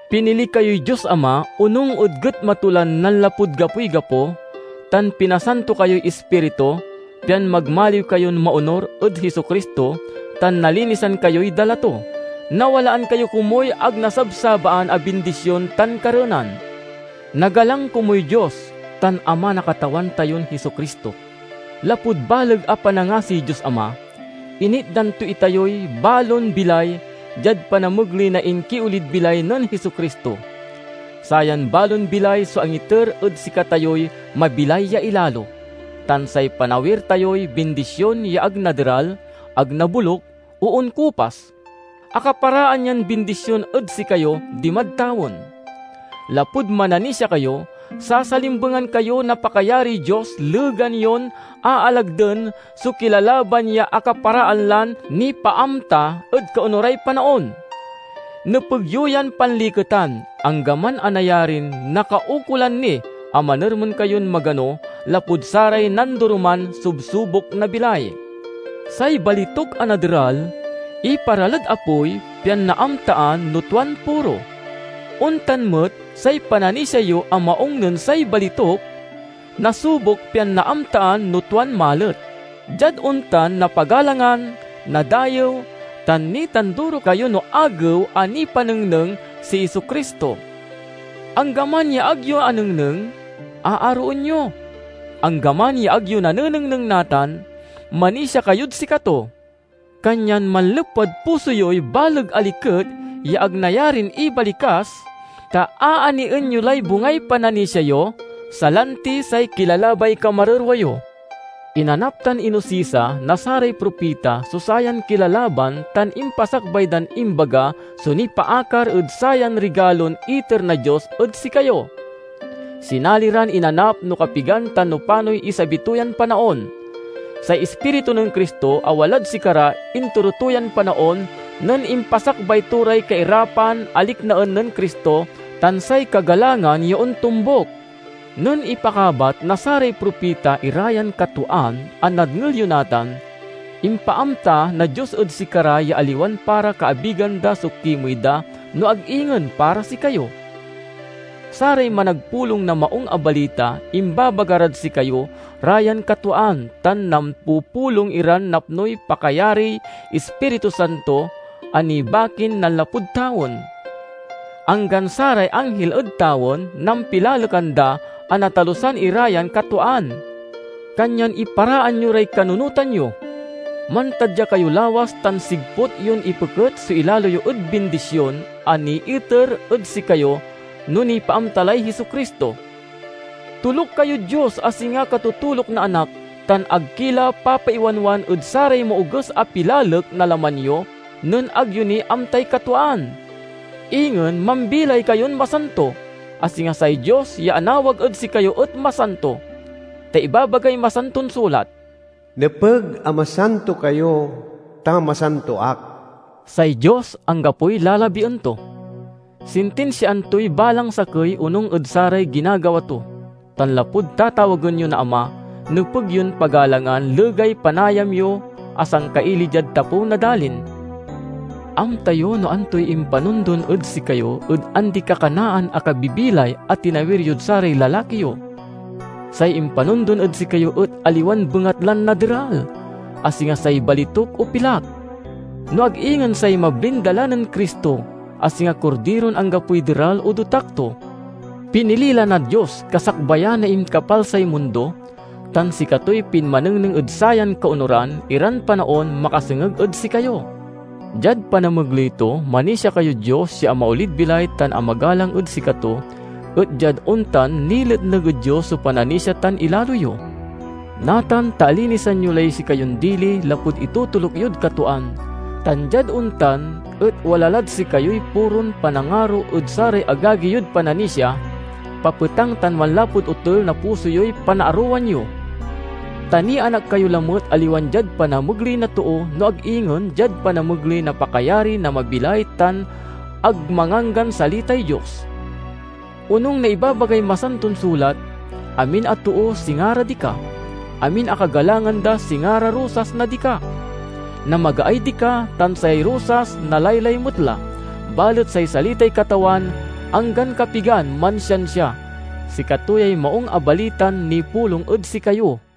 Pinili kayoy Dios Ama, onung ed getma to lan nanlapud gapoy gapo, tan pinasanto kayoy Ispiritu, pian magmaliw kayon maonur ed Jesu-Cristo tan nalinisan kayoy dala to. Nawalaan kayo komuy ag nasabsabaan a bindision tan kareenan. Nagalang komuy Dios tan Ama na Katawan tayon Jesu-Cristo! Lapud baleg a panangasiy Dios Ama, initdan to itayoy balon bilay diad panamegley na inkiolid bilay nen Jesu-Cristo. Sayan balon bilay so angiter ed sikatayoy mabilay ya ilalo, tan say panawir tayoy bindision ya ag naderal, ag naboluk, o onkupas. Akaparaan yan bindision ed sikayo dimad tawen. Lapud mananisia kayo, sasalimbengan kayo na pakayariy Dios legan yon aalagden so kilalaban ya akaparaan lan nipaamta ed kaonuray panaon. Nepeg yo yan panliketan, anggaman a nayarin nakaukolan ni a manermen kayon magano lapud saray nandoroman subsubok na bilay. Say balituk a naderal, iparalad apoy pian naamtaan no tuan puro. Ontan met, say pananisia yo a maung nen say balituk, nasubok pian naamtaan no tuan malet. Diad ontan napagalangan, nadayew, tan nitanduro kayo no Agew a nipanengneng si Jesu-Cristo. Anggaman ya ag yo anengneng, aaroen yo. Anggaman ya ag yo nanenengneng natan, manisia kayod sikato. Kanyan manlepwad puso yoy baleg a liket ya ag nayarin ibalikas, ta aanien yo lay bungay pananisia yo, salanti say kilalabay kamarerwa yo. Inanap tan inosisa na saray propita so sayan kilalaban tan impasakbay dan imbaga so nipaakar ed sayan rigalon iter na Dios ed sikayo. Sinali ran inanap no kapigan tan no panoy isabi to yan panaon. Say Ispiritu nen Cristo a walad sikara intoro to yan panaon, nen impasakbay to ray kairapan a liknaen nen Cristo tan say kagalangan ya ontombuk. Nen ipakabat na saray propita ira yan katwaan a nadngel yo natan, impaamta na Dios ed sikara ya aliwan para kaabigan da so kimey da, no ag ingen para sikayo. Saray managpulong na Maung a Balita imbabaga rad sikayo ra yan katwaan, tan nampupulong iran napnoy pakayariy Ispiritu Santo a nibakin nanlapud tawen. Anggan saray anghil ed tawen nampilalekan da a natalusan ira yan katwaan. Kanyan iparaan yo ray kanunotan yo. Mantadya kayo lawas tan sigput yon ipeket so ilalo yo ed bindision a niiter ed sikayo no nipaamta lay Jesu-Cristo. Toluk kayod Dios a singa katotoluk na anak, tan ag ki la papaiwanwan ed saray maoges a pilalek na laman yo nen ag yo ni amtay katwaan. Ingen mambilay kayon masanto, a singa say Dios ya anawag ed sikayo et masanto. Ta ibabagay Masanton Sulat, "Nepeg a masanto kayo, ta masanto ak." Say Dios anggapoy lalabien to. Sintinsiaan toy balang sakey onung ed saray ginagawa to; tan lapud tatawagen yo na Ama, nepeg yon pagalangan legay panayam yo a sangkaili diad tapew na dalin. Amta yo no antoy impanondon ed sikayo ed andi-kakanaan a kabibilay a tinawir yod saray lalaki yo. Say impanondon ed sikayo et aliwan bengatlan naderal, a singa say balituk, o pilak, no ag ingen say mablin dala nen Cristo, a singa kordiron anggapoy deral o dotak to. Pinili la na Dios kasakbayan na inkapalsay mundo, tan sikatoy pinmanengneng ed sayan kaonuran iran panaon makasengeg ed sikayo. Diad panamegley to, manisia kayod Dios ya amaolid bilay tan amagalang ed sikato, et diad ontan niletneg ed Dios so pananisia tan ilalo yo. Natan ta alinisan yo lay sikayon dili lapud itotoluk yod katwaan, tan diad ontan et wala lad sikayoy puron panangaro ed saray agagi yod pananisia, papetang tan manlapud otel na puso yoy panaarowan yo. Ta nianak kayo lamet aliwan diad panamegley na too, no ag ingen diad panamegley na pakayari na mabilay tan ag manganggan salitay Dios. Onung na ibabagay Masanton Sulat, "Amin a too singa ra dika, amin a kagalangan da singa ra rosas na dika. Namagaay dika, tan say rosas nalaylay met la, balet say salitay Katawan anggan kapigan mansiansia." Sikato yay Maung a Balitan nipulong ed sikayo.